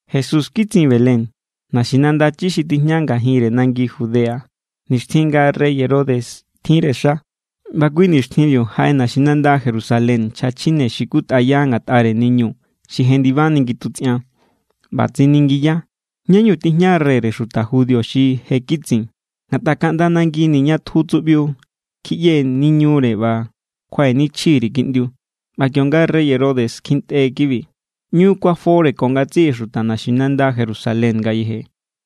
Jesús kitsin Belén, naxinanda chi xi tijña ngajinre nangi Judea, nixtjin nga rey Herodes tjinre xa. ꞌBa kui nixtjinbiu jaꞌe naxinanda Jerusalén nchja chjine xi kutꞌaya ngatꞌare niñu xi jendibani ngitutsꞌian. ꞌBa tsiningiya: —¿Ñá=ñu tijña reyre xuta judío xi je kitsin? Ngatꞌa kaꞌnda nangini̱ ña tju tsuꞌbiu, kjiꞌyee̱ niñure ꞌba kjuaꞌenichji_ri̱ kiꞌndiu. ꞌBa kionga rey Herodes kjintꞌe kibi, ꞌñu kuafore ko ngatsiꞌi xuta naxinanda Jerusalén ngayeje.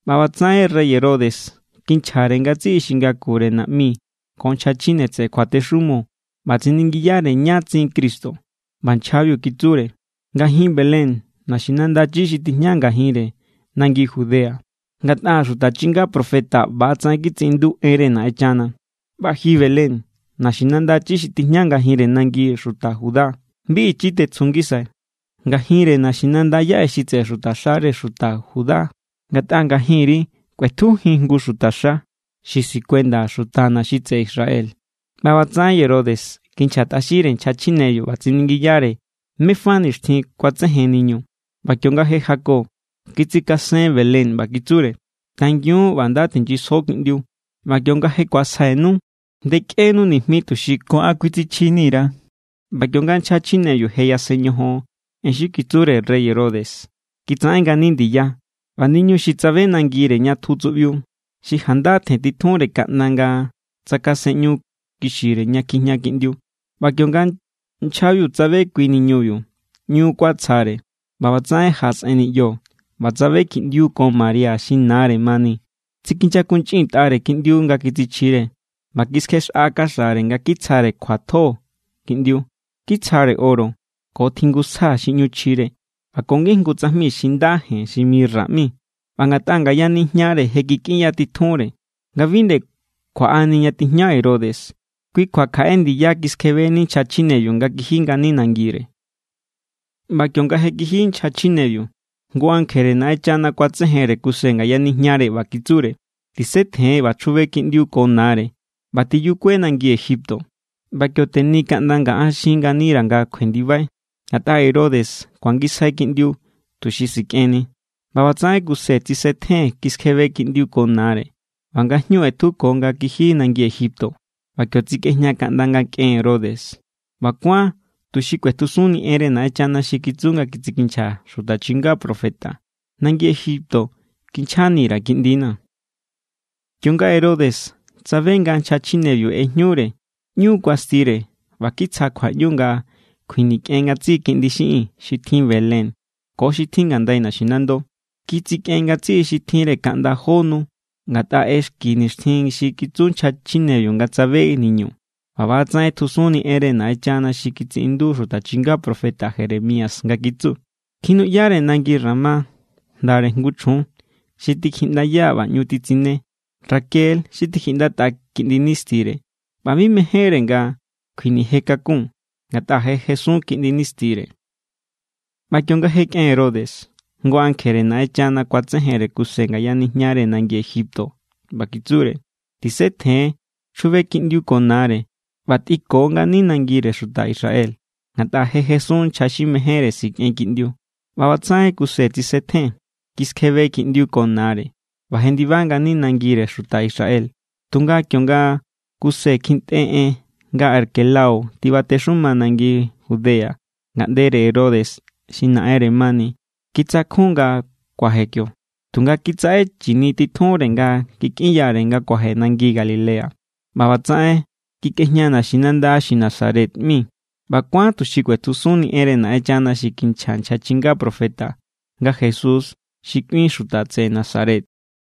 ꞌBa ꞌbatsaꞌen rey Herodes kinchjare ngatsiꞌi xi ngakure naꞌmi ko nchja chjine tseꞌe kjuatexumo, ꞌba tsiningiyare ñá tsin Cristo. ꞌBa nchjabiu kitsure: —Ngajin Belén, naxinanda chi xi tijña ngajinre nangi Judea. Ngatꞌa xuta chinga profeta ꞌba=tsaꞌen kitsiꞌindu enre Naꞌenchana: ꞌBa ji Belén, naxinanda chi xi tijña ngajinre nangire xuta Judá, bi ichi tetsju ngisai ngajinre naxinanda yaꞌe xi tseꞌe xutaxare xuta Judá. Ngatꞌa ngajinri kꞌuetjujin jngu xutaxa, xi sikuenda xutana̱ xi tseꞌe Israel. ꞌBa ꞌbatsaꞌen Herodes kinchjatꞌaxinre nchja chjinebiu ꞌba tsiningiyare mé fa nixtjin kuatsejen niñu. ꞌBa kionga je jako, kitsikasen Belén ꞌba kitsure: —Tangiun ꞌba nda tinyisjo kiꞌndiu. ꞌBa kionga je ku̱asjainu, ndekꞌenu nijmi, tuxi ko an kuitsichjini_ra̱. ꞌBa kionga nchja chjinebiu je yasen ñojon en xi kitsure rey Herodes, kitsaꞌen ngani ndiya. ꞌBa niñu xi tsabe nangire ña tju tsuꞌbiu, xi janda tjentitjunre kaꞌnda nga tsakasenꞌñu kixire ña kjijña kiꞌndiu. ꞌBa kionga nchjabiu tsabe kui niñubiu, ꞌñu kuatsjare. ꞌBa ꞌbatsaꞌen jaꞌasꞌen niꞌyo ꞌba tsabe kiꞌndiu ko María xi nare mani. Tsikinyakunchꞌintꞌare kiꞌndiu nga kitsichjire, ꞌba kiskjexꞌa kaxare nga kitsjare kjuatjo kiꞌndiu. Kitsjare oro ko tjingusja xi ꞌñu chjire ꞌba ko ngijngu tsajmi xi nda jen xi mirra ꞌmi. ꞌBa ngatꞌa ngaya nijñare je kikꞌinyatitjunre nga bi nde kjuaꞌani ña tijña Herodes, kui kjua kjaꞌe ndiya kiskjebeni nchja chjinebiu nga kiji ngani nangire. ꞌBa kionga je kiji nchja chjinebiu, jngu ankjere Naꞌenchana kuatsejenre Kuse ngaya nijñare ꞌba kitsure: —Tisetjen ꞌba chjube kiꞌndiu ko nare ꞌba tiyukue nangi Egipto. ꞌBa kio teni kaꞌnda nga an xin nganira̱ nga kjuendibai, ngatꞌa Herodes kuangisjai kiꞌndiu, tuxi sikꞌenni. ꞌBa ꞌbatsaꞌen Kuse tsisetjen, kiskjebe kiꞌndiu ko nare, ꞌba ngajñu ꞌetjuko nga kiji nangi Egipto. ꞌBa kio tsikꞌejña kaꞌnda nga kꞌen Herodes. ꞌBa kuán tuxi kꞌuetjusunni enre Naꞌenchana xi kitsu nga kitsikinchja xuta chinga profeta: “Nangi Egipto kinchjani_ra̱ Kiꞌndina̱.” Kionga Herodes tsabe nga nchja chjinebiu ꞌejñure, ꞌñu kuastire ꞌba kitsja kjuaꞌñu nga kjuinikꞌen ngatsiꞌi kiꞌndi xiꞌin xi tjin Belén ko xi tjin ngandai naxinando. Kitsikꞌen ngatsiꞌi xi tjinre kaꞌnda jó nu, ngatꞌa ꞌexki nixtjin xi kitsu nchja chjinebiu nga tsabe niñu. ꞌBa ꞌba=tsaꞌen ꞌetjusunni enre Naꞌenchana xi kitsiꞌindu xuta chinga profeta Jeremías nga kitsu: Kjinuꞌyare nangi Ramá jndare jngu chjun, xi tikjiꞌndaya ꞌba ꞌñu titsine. Raquel= xi tikjiꞌndatꞌa kiꞌndi nistire, ꞌba bi nde mejénnire nga kjuinije kakun, ngatꞌa je jesun kiꞌndi nistire. ꞌBa kionga je kꞌen Herodes, jngu ankjere Naꞌenchana kuatsejenre Kuse ngaya nijñare nangi Egipto ꞌba kitsure: —Tisetjen, chjube kiꞌndiu ko nare ꞌba tꞌinko ngani nangire xuta Israel, ngatꞌa je jesun nchja xi mejénre sikꞌen kiꞌndiu. ꞌBa ꞌbatsaꞌen Kuse tsisetjen, kiskjebe kiꞌndiu ko nare, ꞌba jendiba ngani nangire xuta Israel. Tunga kionga Kuse kjintꞌe en nga Arquelao tibatexuma nangi Judea ngaꞌndere Herodes xi naꞌenre mani, kitsakjun nga kuaje kio. Tunga kitsaꞌe chini titjúnre nga kikꞌinyare nga kuaje nangi Galilea. ꞌBa ꞌbatsaꞌen kikꞌejña naxinanda xi Nazaret ꞌmi. ꞌBa kuán tuxi kꞌuetjusunni enre Naꞌenchana xi kinchja nchja chinga profeta, nga Jesús xi kꞌuin xuta tseꞌe Nazaret.